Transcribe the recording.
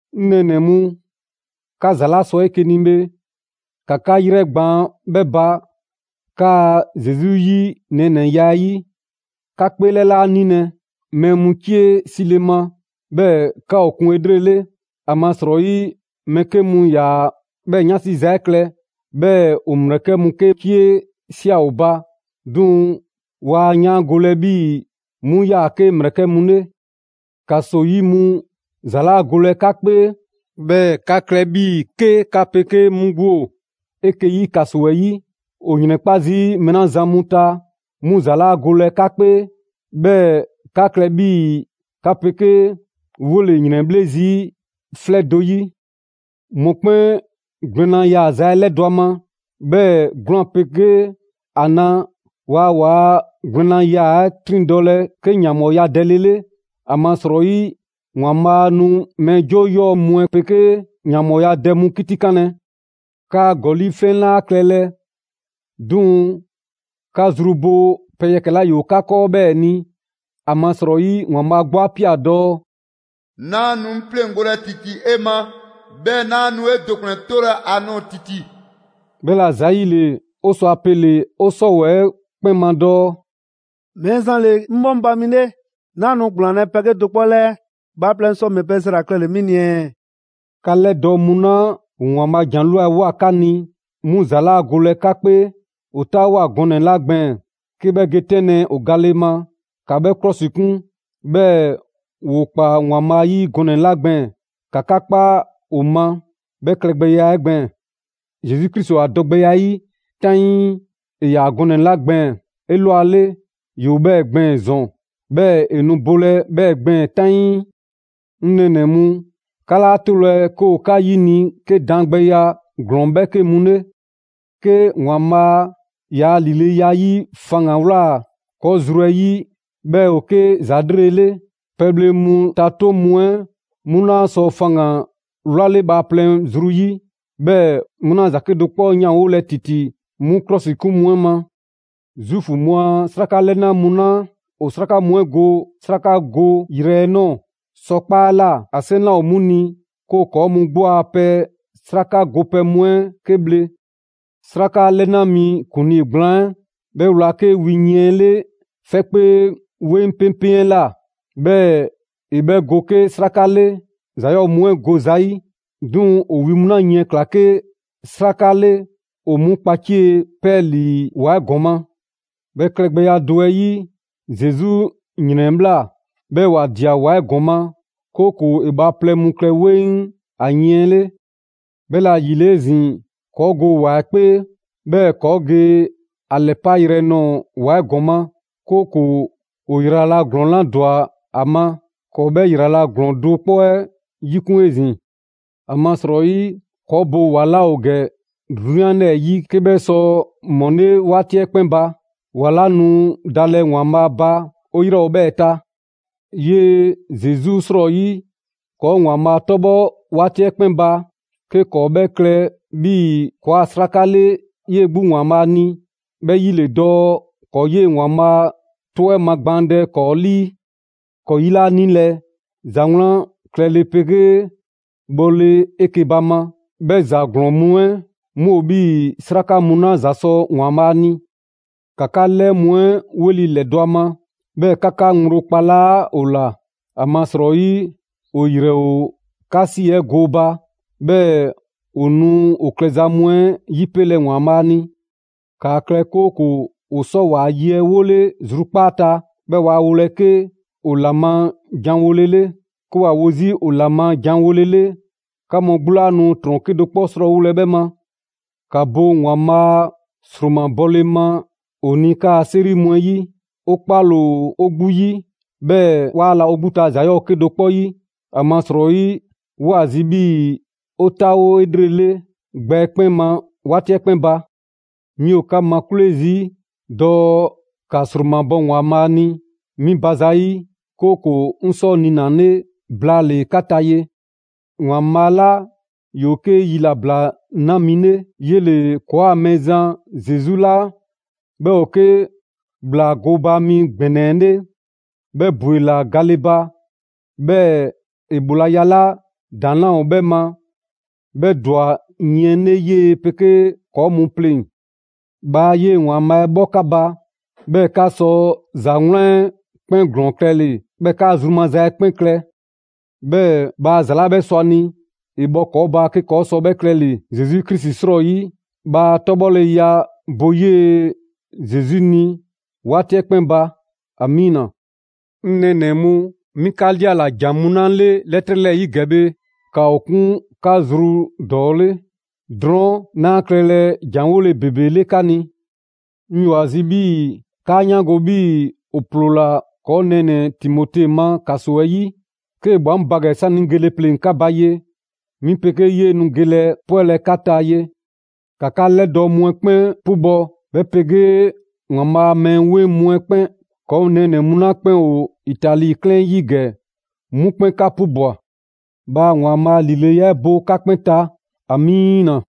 'Ŋ nɛɛnɛ‑ mu, 'ka ‑za 'la sɔ 'eke‑ ni bhe, ‑ka 'ka 'yrɛgbaan‑ 'bhɛ ba 'kaa‑ Zesu 'yi nɛɛnɛya 'ɛ 'yi. 'Ka 'kpeelɛ 'laa 'nilɛ‑ mɛɛ mu 'cie 'sile ma, 'bhɛɛ‑ 'ka ‑o 'kun 'elrele. ‑Amasrɔyi mɛɛ 'ke mu 'yaa‑ 'bhɛɛ‑ 'yansi za 'ɛ klɛ, 'bhɛɛ‑ ‑o ‑mlɛkɛ' mu 'ke 'cie ꞊sia ‑o ba; 'duŋ‑ waa yaangolɛ 'bhii‑ 'mu 'yaa‑ 'ke ‑mlɛkɛ' mu 'le. ‑Kaso 'yi mu ‑za 'laa golɛ 'ka 'kpee, 'bhɛɛ‑ ‑kaa klɛ 'bhii‑ 'ke 'ka 'pegee mu 'gbu ‑o 'eke‑ 'yi ‑kaso 'ɛ 'yi. ‑O ‑yrɛnkpa' zii' mɛɛ 'la zan mu ta, 'mu ‑za 'laa golɛ 'ka 'kpee, 'bhɛɛ‑ ‑kaa klɛ 'bhii‑ 'ka 'pegee 'wole‑ ‑yrɛnbhle' zii' 'flɛ do 'yi. Mɔkpɛn' gwlɛnna yaaza 'ɛ 'lɛdɔ‑ ‑a ma, 'bhɛɛ‑ 'gwlaan‑ 'pegee ‑a na, waa ‑waa' gwlɛnnayaa 'ɛ 'triŋdɔlɛ 'ke ‑yanbhɔɔya dɛle 'le. ‑Amasrɔyi ‑Waanbhaa' nu mɛɛ 'joo 'yɔɔ‑ mu 'ɛ 'pegee ‑yanbhɔɔya dɛ mu 'kitikanlɛ. 'Kaa‑ ‑gɔli' 'flɛn 'laa klɛlɛ; 'duŋ‑ 'ka zru bo pɛ yɛkɛ‑ 'la ‑yoo 'ka 'kɔɔ 'bhɛɛ‑ ni. ‑Amasrɔyi ‑Waanbhaa' 'gbu 'a ꞊pia dɔɔ: «'Naa nu 'ŋ 'pleŋgolɛ ‑titi 'e ma, 'bhɛɛ‑ 'naa nu 'e do ‑kplɛn 'tolɛ‑ ‑a nɔɔ‑ ‑titi.» 'Bhɛla‑ ‑zayile, 'o sɔ a pele‑ 'o 'sɔwɛɛ‑ 'kpɛn ma dɔɔ: «Mɛɛzan ‑le 'ŋ 'bhɔŋba‑ mi 'le, 'naa nu ‑gblaanlɛ' pɛ 'kedo‑ 'kpɔ 'lɛɛ. Bhaaplɛŋ sɔ ‑mɛ pɛ ‑za ‑la klɛle‑ 'mi ni ɛɛ?» 'Ka 'lɛdɔɔ‑ mu 'la ‑o ‑Waanbhaa' a ‑jan 'ɛ ꞊lwa ꞊woa 'ka ni, 'mu ‑za 'laa golɛ 'ka 'kpee. ‑O 'taawoa꞊ gɔnɛ‑ 'la gbɛɛn‑ 'ke 'bhɛ ge 'tɛnlɛ‑ ‑o gale ma, ‑ka 'bhɛ 'klɔsikun; 'bhɛɛ‑ ‑woo ‑kpaa ‑Waanbhaa' ‑yi gɔnɛ‑ 'la gbɛɛn‑, ‑ka 'ka 'kpa ‑o ma 'bhɛ klɛgbɛya 'ɛ gbɛɛn‑. Zesu Krisi ‑o ‑a dɔgbɛya 'ɛ 'yi 'taŋii: ‑e ‑yaa gɔnɛ‑ 'la gbɛɛn‑ 'elwale, ‑yoo 'bhɛɛ‑ gbɛɛn‑ ‑zɔn; 'bhɛɛ‑ ‑e nu bolɛ 'bhɛɛ‑ gbɛɛn‑ 'taŋii. 'Ŋ nɛɛnɛ‑ mu, 'ka 'laa 'tolɛ‑ 'ke ‑o 'ka 'yini‑ 'ke daangbɛya ‑glɔɔn 'bhɛɛke mu 'le. 'Ke ‑Waanbhaa' ‑yaa' ‑lileya 'ɛ 'yi faŋgan‑ ‑wlaa ‑kɔɔ' zru 'ɛ 'yi, 'bhɛ ‑o 'ke ‑za 'lrele‑ 'le. Pɛbhle mu ta 'toŋ mu 'ɛ 'mu laa sɔ faŋgan‑ 'wlale bhaaplɛŋ zru 'yi, 'bhɛɛ‑ 'mu 'laa ‑za 'kedo‑ 'kpɔ 'yanwolɛ ‑titi 'mu 'klɔsikun mu 'ɛ ma. Zuufu mu a 'sraka 'lɛna mu 'la ‑o 'sraka mu 'ɛ go 'srakagoyrɛ 'ɛ ꞊nɔɔ sɔkpaa' 'ɛ ꞊la, ‑a 'seŋ 'laa ‑o 'mu ni 'ke ‑o 'kɔɔ‑ mu 'gbu a pɛ 'sraka gopɛ mu 'ɛ 'ke bhle. 'Sraka 'lɛna mi ‑kuŋlii gblaan 'ɛ, 'bhɛ wla 'ke wi yiɛn 'ɛ 'le 'fɛkpee 'weŋ 'peŋpeŋ 'ɛ ꞊la; 'bhɛɛ‑ ‑e 'bhɛ go 'ke 'sraka 'le ‑za 'yɔɔ‑ mu 'ɛ go zayi'. 'Duŋ‑ ‑o wi mu 'la yiɛn 'ɛ ꞊kla 'ke 'sraka 'le ‑o 'mu kpacie 'pɛɛlii‑ ‑wa 'ɛ ‑gɔma'. 'Bhɛ klɛgbɛya do 'ɛ 'yi, Zesu ‑yrɛnbhla 'bhɛɛ‑ ‑wa ꞊dia ‑wa 'ɛ ‑gɔma'; 'kooko‑ ‑e bhaaplɛŋ mu klɛ 'weŋ ‑a yiɛn 'ɛ 'le. 'Bhɛla‑ ‑yile 'ezin‑, ‑kɔɔ' go ‑wa 'ɛ 'kpee, 'bhɛɛ‑ ‑kɔɔ' ge ‑a ‑lɛpayrɛ nɔɔ‑ ‑wa 'ɛ ‑gɔma'; 'kooko‑ ‑o ‑yrala' ‑glɔɔn 'la ‑dwa ‑a ma, ‑kɔɔ' 'bhɛ ‑yrala ‑glɔɔn do 'kpɔ 'ɛ 'yikun‑ 'ezin‑. ‑Amasrɔyi ‑kɔɔ' bo ‑wa 'laa ‑o ‑gɛ 'drunyan 'lɛɛ‑ 'yi, 'ke 'bhɛ sɔ ‑mɔle' 'waati 'ɛ 'kpɛn ba. ‑Wa 'la nu dalɛ ‑Waanbhaa' ba 'o 'yrɛ ‑o 'bhɛɛ‑ ta. 'Yee‑ Zesu 'srɔyi, ‑kɔɔ' ‑Waanbhaa' 'tɔbhɔ 'waati 'ɛ 'kpɛn ba 'ke ‑kɔɔ' 'bhɛ klɛ 'bhii‑ ‑kɔɔa' 'sraka 'le 'yee‑ 'gbu ‑Waanbhaa' ni: 'bhɛ 'yi ‑le dɔɔ ‑kɔɔ' 'yee‑ ‑Waanbhaa' 'tɔ 'ɛ magbaandɛ ‑kɔɔ' 'lii. ‑Kɔɔ' 'yi 'laa 'nilɛ‑ ‑za 'wlan klɛle 'pegee bhɔle 'eke‑ ba ma; 'bhɛ ‑za ‑glɔɔn mu 'ɛ 'mu ‑o 'bhii‑ 'sraka mu 'la ‑za sɔ ‑Waanbhaa' ni. ‑Ka 'ka 'lɛɛ mu 'ɛ 'weli‑ ‑lɛdɔ' a ma, 'bhɛɛ‑ ‑ka 'ka ŋgblo 'kpala ‑o ‑la. ‑Amasrɔyi ‑o ‑yrɛn ‑o 'ka 'si 'ɛ gooba; 'bhɛɛ‑ ‑o nu ‑o klɛza mu 'ɛ 'yipelɛ ‑Waanbhaa' ni. ‑Kaa klɛ 'kooko‑ ‑o sɔ ‑waa' ye 'ɛ 'wole zrukpaa' ta, 'bhɛɛ‑ waa wolɛ 'ke ‑o ‑la ma janwolele. 'Ke ‑wa wo 'zi ‑o ‑la ma janwolele, 'ka mu 'gbu 'laa nu ‑trɔn 'kedo‑ 'kpɔ 'srɔɔwolɛ 'bhɛ ma. ‑Ka bo ‑Waanbhaa' ‑sromabɔle ma 'o ni 'kaa‑ 'seri mu 'ɛ 'yi. 'O 'kpale‑ ‑o 'o 'gbu 'yi, 'bhɛɛ‑ 'waa la 'o 'gbu ta ‑za 'yɔɔ‑ 'kedo‑ 'kpɔ 'yi. ‑Amasrɔyi 'woo‑ ‑a zi 'bhii‑ 'o 'taawo 'elrele gbɛ 'ɛ 'kpɛn ma 'waati 'ɛ 'kpɛn ba. 'Mi ‑o 'ka makwle' zii' dɔɔ ‑ka ‑sromabɔ ‑Waanbhaa' ni 'mi ba zayi', 'kooko‑ 'ŋ sɔ niinale blaale‑ 'ka ta ye. ‑Waanbhaa' 'la ‑yoo 'ke yilabla 'na mi 'le, 'yele‑ ‑kɔɔa' Mɛɛzan Zesu 'la 'bhɛ ‑o 'ke ‑Bhlaa gooba mi ‑gbɛnɛ 'ɛ 'le 'bhɛ ‑bwela gale ba; 'bhɛɛ‑ ‑e ‑bhoolaya 'la ‑daŋ' 'laa ‑o 'bhɛ ma 'bhɛ ‑dwa yiɛn 'le 'yee‑ 'pegee ‑kɔɔ' mu pleŋ‑. Bhaa 'yee‑ ‑Waanbhaa' 'ɛ 'bhɔ 'ka ba, 'bhɛɛ‑ 'ka sɔ ‑za 'wlan 'ɛ 'kpɛn ‑glɔɔn klɛle‑, 'bhɛɛ‑ 'kaa zru maza 'ɛ 'kpɛn klɛ. 'Bhɛɛ‑ bhaa ‑za 'la 'bhɛ sɔ ‑a ni, ‑e bhɔ ‑kɔɔ' ba 'ke ‑kɔɔ' sɔ 'bhɛ klɛle‑ Zesu Krisi 'srɔyi. Bhaa 'tɔbhɔleya bo 'yee‑ Zesu ni 'waati 'ɛ 'kpɛn ba! ‑Amiina! 'Ŋ nɛɛnɛ‑ mu, 'mi 'ka 'liala‑ ‑jan mu 'la 'le 'lɛtrɛ 'lɛɛ‑ 'yi ‑gɛ bhe, ‑ka ‑o 'kun 'ka zru ‑dɔɔ 'le. Drɔɔn' 'naa klɛlɛ ‑janwole ‑bebe 'le 'ka ni. 'Ŋ 'yoo‑ ‑a zi 'bhii‑ 'kaa 'yaango‑ 'bhii‑ ‑o ‑ploola ‑kɔɔ' nɛɛnɛ‑ Timote ma ‑kaso 'ɛ 'yi. 'Kee‑ ꞊bhwa 'ŋ ba ‑gɛ 'sani‑ 'ŋ gele pleŋ‑ 'ka ba ye, 'mi 'pegee 'yee‑ nu gelɛ 'pwɛlɛ‑ 'ka ta ye. ‑Ka 'ka 'lɛdɔɔ‑ mu 'ɛ 'kpɛn 'pubɔ‑, 'bhɛ 'pegee ‑Waanbhaa' a mɛɛ 'weŋ mu 'ɛ 'kpɛn. ‑Kɔɔ' nɛɛnɛ‑ mu 'la 'kpɛn ‑o Itali 'klɛɛn 'ɛ 'yi ‑gɛ, 'mu 'kpɛn 'ka 'pubwa‑. Bhaa ‑Waanbhaa' a ‑lileya 'ɛ bo 'ka 'kpɛn ta! Amiina.